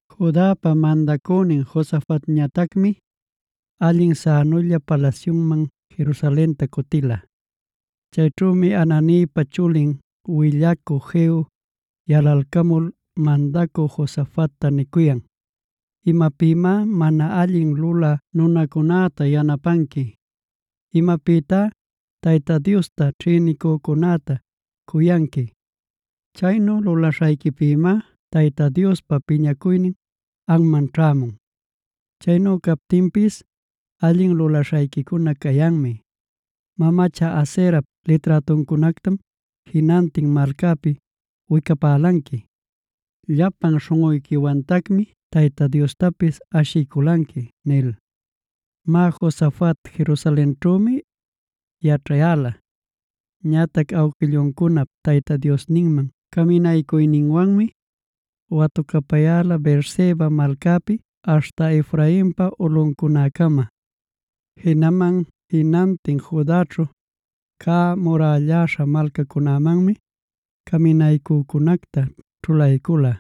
Judapa mandacünin Josafatñatacmi, allin sänulla palasyunman Jerusalenta cutila. Chayćhümi Hananipa chulin willacü Jehu yalalcamul, mandacü Josafatta nicuyan: “¿Imapïmá mana allin lulä nunacunäta yanapanqui? ¿Imapïtá Tayta Diosta ćhïnicücunäta cuyanqui? Chaynu lulaśhayquipïmá Tayta Diospa piñacuynin anman ćhämun. Chaynu captinpis allin lulaśhayquicuna cayanmi. Mamacha Aserap liträtuncunactam jinantin malcapi wicapälanqui, llapan śhunꞌuyquiwantacmi Tayta Diostapis ashiyculanqui” nil. Má, Josafat Jerusalenćhümi yaćhayäla. Ñatac awquilluncunap Tayta Diosninman caminaycuyninwanmi, watucapayäla Beerseba malcapi aśhta Efrainpa ulꞌuncunacama. Jinaman jinantin Judaćhu cä murälläśha malcacunämanmi caminaycücunacta ćhulaycula.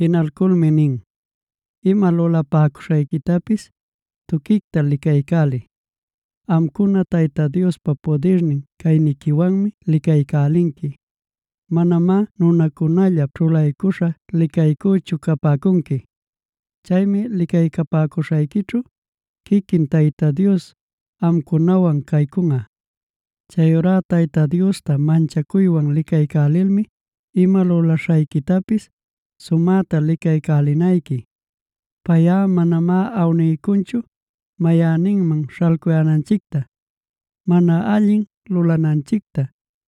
Jinalculmi nin: “Ima lulapäcuśhayquitapis tuquicta licaycäliy. Amcuna Tayta Diospa pudirnin cayniquiwanmi licaycälinqui; manamá nunacunallap ćhulaycuśha licaycüchu capäcunqui. Chaymi licaycapäcuśhayquićhu quiquin Tayta Dios amcunawan caycunꞌa. Chayurá Tayta Diosta manchacuywan licaycälilmi ima lulaśhayquitapis sumäta licaycälinayqui. Payꞌa manamá awniycunchu mayanninman śhalcuyänanchicta, mana allin lulananchicta,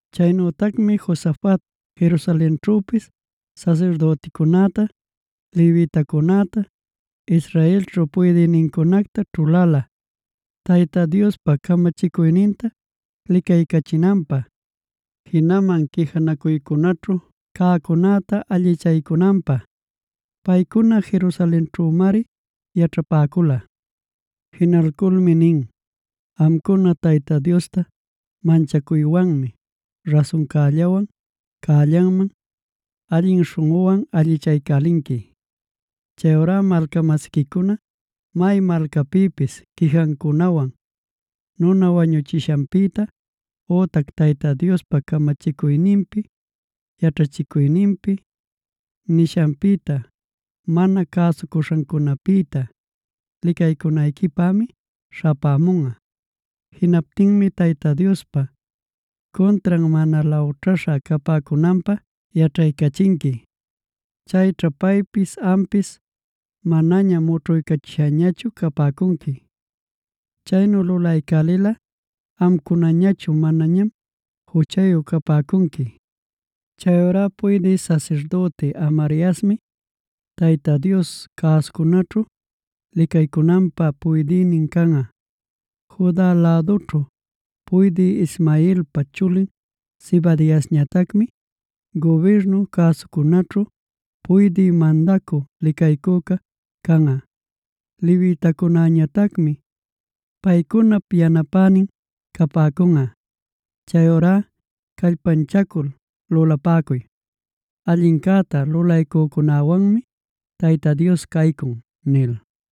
Chaynütacmi Josafat Jerusalenćhüpis sasirdüticunäta, levitacunäta, Israelćhu puydïnincunacta ćhulala Tayta Diospa camachicuyninta licaycachinanpä, jinaman quijanacuycunaćhu cäcunäta allichaycunanpä. Paycuna Jerusalenćhümari yaćhapäcula. Jinalculmi nin: “Amcuna Tayta Diosta manchacuywanmi rasuncällawan, cällanman allin śhunꞌuwan allichaycälinqui. Chayurá malca-masiquicuna may malcapïpis quijancunawan nuna wañuchishanpïta ütac Tayta Diospa camachicuyninpi, yaćhachicuyninpi, nishanpïta mana cäsucuśhancunapïta licaycunayquipämi śhapämunꞌa. Jinaptinmi Tayta Diospa cuntran mana lawćhaycuśha capäcunanpä yaćhaycachinqui. Chayćha paypis ampis manaña mućhuycachishañachu capäcunqui. Chaynu lulaycälilꞌa amcunañachu manañam juchayu capäcunqui. “Chayurá puydï sasirdüti Amariasmi Tayta Dios cüsacunaćhu licaycücunäpa puydïnin canꞌa. Juda ayllućhu puydï Ismaelpa chulin Zebadiasñatacmi gubirnun cüsacunaćhu puydï mandacü licaycüca canꞌa. Levitacunäñatacmi paycunap yanapänin capäcunꞌa. Chayurá callpanchacul lulapäcuy. Allincäta lulaycücunäwanmi Tayta Dios caycun” nil.